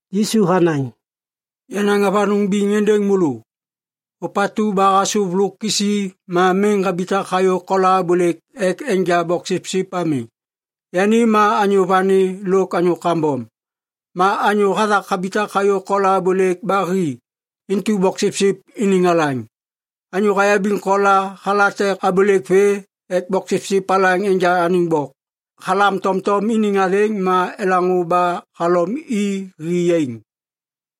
Yisu hanaŋ, “Yanaŋ avanôŋ biŋ êndêŋ môlô. Ôpatu ba hasôv lôk kisi ma miŋ habitak hayô kola abôlêk ek enja bôksipsip ami, yani ma anyô vani lôk anyô kambom. Ma anyô hathak habitak hayô kola abôlêk ba hi, intu boksipsip iniŋ alaŋ. Anyô hayabiŋ kola halate abôlêk vê ek boksipsip alaŋ enja anêŋ bok. Halam tomtom iniŋ athêŋ ma elaŋô ba halom i hi yaiŋ.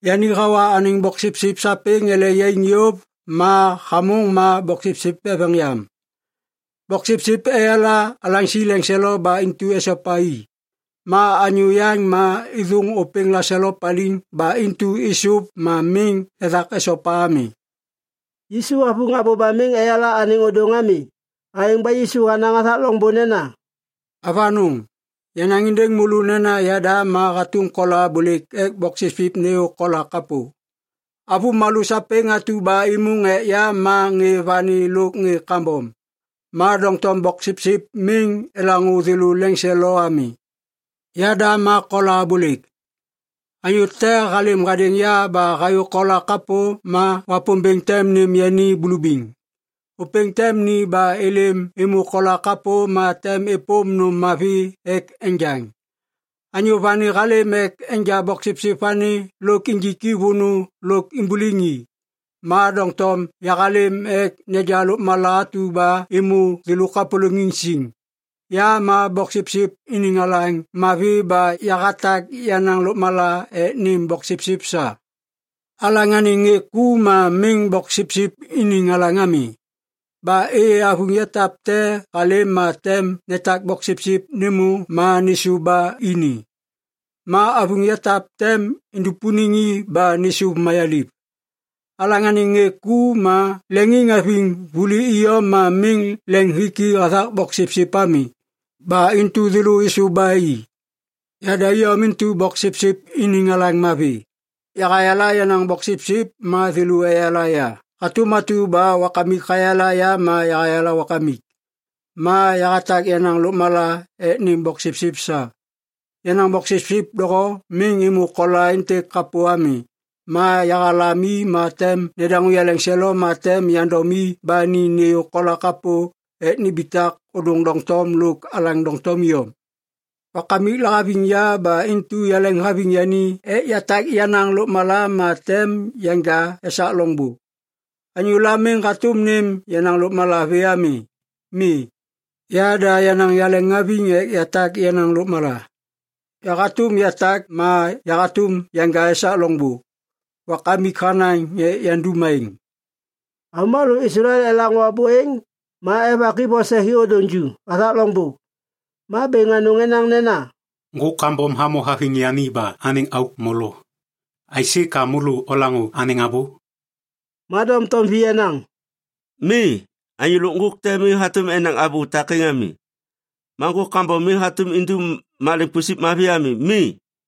Yani hawa anêŋ boksipsip sapêŋ ele yaiŋ yôv ma hamôŋ ma boksipsip eveŋ yam. Boksipsip eyala alaŋsi leŋselo ba intu esopa i. Ma anyô yaŋ ma êthôŋ ôpêŋ laselo paliŋ ba intu êsôv ma miŋ ethak esopa ami.” Yisu havuŋ abô ba miŋ eyala anêŋ ôdôŋ ami. Aêŋ ba Yisu hanaŋ hathak loŋbô nena, “Avanôŋ! Yanaŋ êndêŋ môlô nena yada ma hatôm kola abôlêk ek boksipsip nêyô kola kapô. Avômalô sapêŋ atu ba êmôŋ ek ya ma ŋê vani lôk ŋê kambom. Ma doŋtom boksipsip miŋ elaŋô thêlô leŋiŋselo ami. Yada ma kola abôlêk. Anyô te halêm hadêŋ ya ba hayô kola kapô ma Wapômbêŋ tem nêm yani bulubiŋ. Ôpêŋ tem ni ba êlêm êmô kola kapô ma tem êpôm nôm mavi ek enjaŋ. Anyô vani halêm ek enja boksipsip vani lôk injik i vônô lôk imbuliŋ i. Ma doŋtom yahalêm ek neja lôkmala atu ba êmô thêlô kapôlôŋiŋ siŋ. “Ya ma boksipsip iniŋ alaŋ mavi ba yahatak yenaŋ lôkmala ek nêm boksipsip sa. Alaŋ anêŋ ŋê ku ma miŋ boksipsip iniŋ alaŋ ami. Ba êyê avuŋ yatap te halêm ma tem netak boksipsip nêmô ma nêsôv ba ini. Ma avuŋ yatap tem indupuniŋ i ba nêsôv mayaliv. Alaŋ anêŋ ŋê ku ma leŋiŋhaviŋ vuli iyom ma miŋ leŋiŋhiki hathak boksipsip ami. Ba intu thêlô êsôv ba i. “Yada iyom intu boksipsip iniŋ alaŋ mavi. Yahayala yenaŋ boksipsip ma thêlô eyala ya hatôm atu ba Wakamik hayala ya ma yahayala Wakamik. Ma yahatak yenaŋ lôkmala ek nêm boksipsip sa. Yenaŋ boksipsip doho miŋ êmô kola êntêk kapô ami. Ma yahalam i ma tem nedaŋô yaleŋselo ma tem yandom i ba ni nêyô kola kapô ek nimbitak ôdôŋ doŋtom lôk alaŋ doŋtom iyom. Wakamik lahaviŋ ya ba intu yaleŋhaviŋ yani ek yatak yenaŋ lôkmala ma tem yanja esak loŋbô. Anyôla miŋ hatôm nêm yenaŋ lôkmala vê ami. Mi. Yada yenaŋ yaleŋhaviŋ ek yatak yenaŋ lôkmala. Yahatôm yatak ma yahatôm yanja esak loŋbô. Wakamik hanaŋ ek yandum aêŋ.” Avômalô Islael elaŋô abô êŋ ma evak i vose hi ôdôŋ ju hathak loŋbô. Ma bêŋ anôŋ enaŋ nena, “Ŋgôk kambom hamô haviŋ yani ba anêŋ auk molo. Aisê ka môlô olaŋô anêŋ abô?” Ma doŋtom vi enaŋ, “Mi! Anyô lôk ŋgôk te miŋ hatôm enaŋ abô takêŋ ami. Ma ŋgôk kambom miŋ hatôm indum maleŋ pusip mavi ami. Mi.”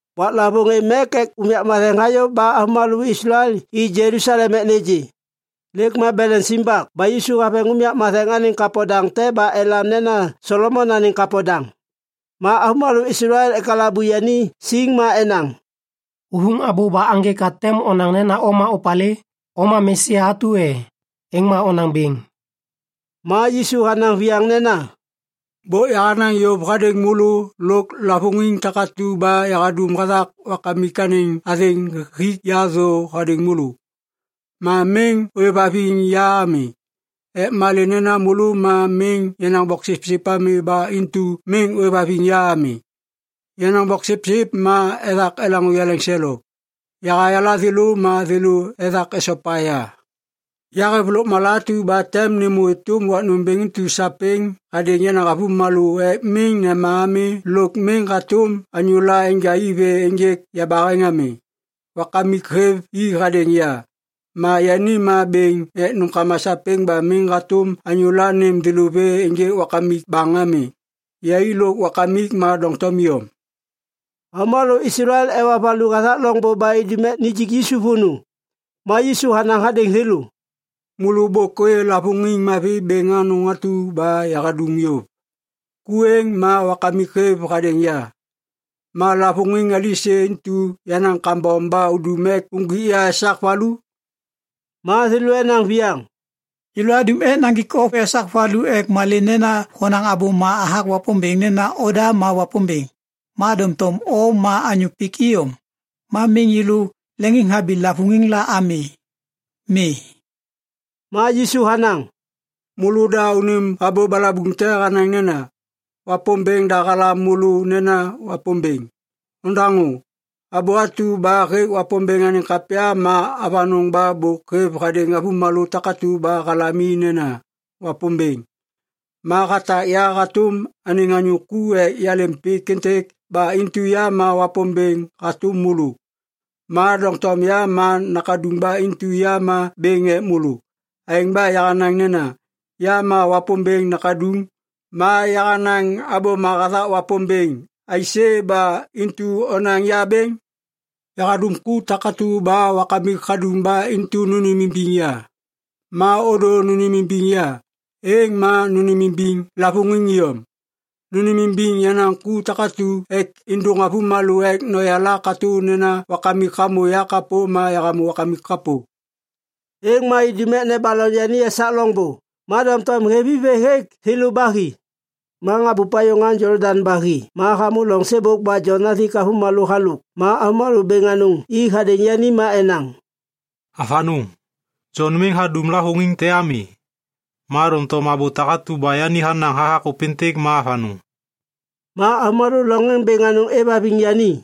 Waklavôŋ Êv Mek Ek Unyak Matheŋ hayô ba avômalô Islael i Jelusalem ek nêgê. Lêk ma beleŋ simbak ba Yisu haveŋ unyak matheŋ anêŋ kapo daŋ te ba elam nena Solomon Anêŋ Kapo Daŋ. Ma avômalô Islael ekalabu yani siŋ ma enaŋ, “Huvuŋ abô ba aŋgê ka tem onaŋ nena o ma opalê? O ma Mesia atu e? Êŋ ma onaŋ bêŋ.” Ma Yisu hanaŋ viyaŋ nena, “Bôk yahanaŋ yôv hadêŋ môlô lôk lavôŋiŋ takatu ba yahadum hathak Wakamik anêŋ athêŋ hik ya thô hadêŋ môlô. Ma miŋ ôêvhaviŋ ya ami. Ek malê nena môlô ma miŋ yenaŋ boksipsip ami ba intu miŋ ôêvhaviŋ ya ami. Yenaŋ boksipsip ma ethak elaŋô yaleŋselo. Yahayala thêlô ma thêlô ethak esopa ya. Yahêv lôkmala atu ba tem nêmô êtôm wak nômbêŋ intu sapêŋ hadêŋ yenaŋ avômalô ek miŋ nema ami lôk miŋ hatôm anyôla enja i vê ênjêk yabaheŋ ami. Wakamik hêv i hadêŋ ya, ma yani ma bêŋ ek nômkama sapêŋ ba miŋ hatôm anyôla nêm thêlô vê ênjêk Wakamik baŋ ami. Yai lôk Wakamik ma doŋtom iyom.” Avômalô Islael ewa valu hathak loŋbô ba idum ek nijik Yisu vônô. Ma Yisu hanaŋ hadêŋ thêlô, “Môlô bôk ôyê lavôŋiŋ mavi bêŋ anôŋ atu ba yahadum yôv. Ku êŋ ma Wakamik hêv hadêŋ ya. Ma lavôŋiŋ alisê intu yenaŋ kambom ba udum ek uŋgwik ya esak valu?” Ma thêlô enaŋ viyaŋ, “Yêlô adum ek naŋgik o esak valu ek malê nena honaŋ abôma hathak Wapômbêŋ nena oda ma Wapômbêŋ. Ma doŋtom o ma anyô pik iyom. Ma miŋ yêlô leŋiŋhabi lavôŋiŋ la ami. Mi.” Ma Yisu hanaŋ, “Môlô da unim abô balabuŋ te hanaŋ nena, ‘Wapômbêŋ da halam môlô nena wapômbêŋ.’ “Odaŋô! Abô atu ba hêk Wapômbêŋ anêŋ kapya ma avanôŋ ba bôk hêv hadêŋ avômalô takatu ba halam i nena, ‘wapômbêŋ’. Ma hatak ya hatôm anêŋ anyô ek yalêm pik êntêk ba intu ya ma wapômbêŋ hatôm môlô. Ma doŋtom ya ma nakaduŋ ba intu ya ma bêŋ ek môlô. Aêŋ ba yahanaŋ nena, ‘Ya ma Wapômbêŋ Nakaduŋ’ ma yahanaŋ abôma hathak Wapômbêŋ aisê ba intu onaŋ ya bêŋ? Yahadum ku takatu ba Wakamik hadum ba intu nônêmimbiŋ ya. Ma ôdô nônêmimbiŋ ya, êŋ ma nônêmimbiŋ lavôŋiŋ iyom. Nônêmimbiŋ yenaŋ ku takatu ek êndôŋ môlô ek noyala katô nena Wakamik hamô ya kapô ma yahamô Wakamik kapô.” Êŋ ma idum ek nebaloŋ yani esak loŋbô. Ma doŋtom hêv i vê hêk thêlô ba hi. Ma habup hayô ŋaŋ Jolodaŋ ba hi ma hamô loŋ sêbôk ba Jon hathik avômalô halôk ma avômalô bêŋ anôŋ i hadêŋ yani ma enaŋ, “Avanôŋ! Jon miŋ hadum lavôŋiŋ te ami. Ma doŋtom abô takatu ba yani hanaŋ hathak ôpêntêk ma avanôŋ.” Ma avômalô loŋ êŋ bêŋ anôŋ êvhaviŋ yani.